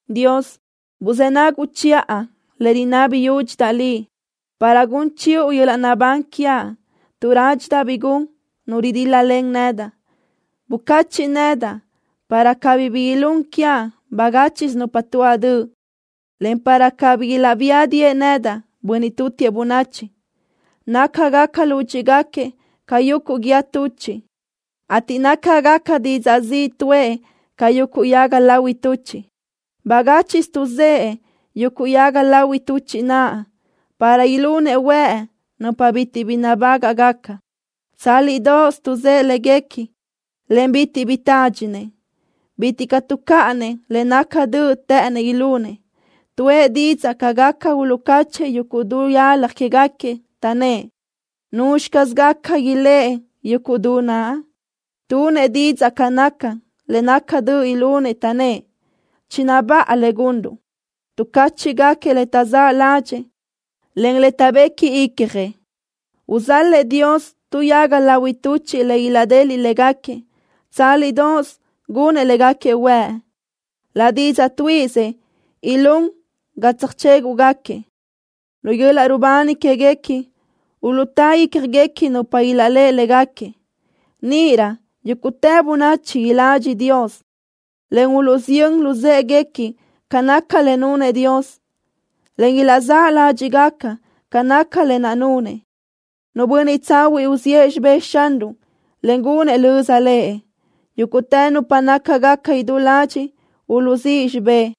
Dios, buzë́ naguʼ chiʼa le rinabi yúdxidaʼ Liʼ, para gun chiʼu yöl-laʼ naʼbán quiaʼ tuʼ rádxidaʼ bi gun nu ridíl-lalen nedaʼ. Bucachiʼ nedaʼ para cabí bi ilún quiaʼ bagáchiʼsö nupa tuáʼ döʼ, en para cabí ilaʼbía diʼë nedaʼ bönniʼ tutiëʼ bönachi. Nácagaca lúdxiʼgaquiëʼ ca yuguʼ guíë tuchiʼ, ateʼ nácagaca didzaʼ ziʼ tuʼë ca yuguʼ yaga lahui tuchiʼ. Bagáchiʼsö tuʼzë́ yuguʼ yaga lahui tuchiʼ naʼ para ilunëʼ huëʼ nupa bitiʼ bi nabágaʼgaca. Tsálidoʼos tuʼzë́ léguequi, en bitiʼ bi tádxinëʼ. Bitiʼ caʼ tuʼcáʼanëʼ le naca döʼ të́ʼënëʼ ilunëʼ. Tuʼë didzaʼ ca gaca uluʼcáchëʼë yuguʼ du yalaj quégaquiëʼ, taʼnnë́ʼ: “¿Nuzxi caz gaca iléʼe yuguʼ du naʼ?” Tunëʼ didzaʼ ca naca le naca döʼ ilunëʼ, taʼnnë́ʼ: “Chinabáʼa le gunruʼ.” Tuʼcáchiʼgaquiëʼ le taʼzáʼ ládxëʼë, en le taʼbequi icjëʼ. Uzal-lëʼ Dios tu yaga lahui tuchiʼ le ideliʼ légaquiëʼ. Tsálidoʼos gunëʼ légaquiëʼ huëʼ. Laʼ didzaʼ tuíʼisëʼ ilún ga tseajchéguʼgaquiëʼ. Lu yöl-laʼ rubani quéguequi uluʼtá ícjaguequi nupa ilaʼléʼe légaquiëʼ. Níʼirö yúguʼtë bönachi iladxi Dios, en uluʼsiyö́n luzë́ʼeguequi ca naca le nunëʼ Dios, en ilaʼzáʼ ládxiʼgaca ca naca lë naʼ nunëʼ. Nu bönniʼ tsahuiʼ uziʼë xibë́ʼ Xanruʼ, en gunëʼ löza Lëʼ. Yúguʼtë nupa nácagaca idú ladxiʼ uluʼzíʼ xibë́ʼ.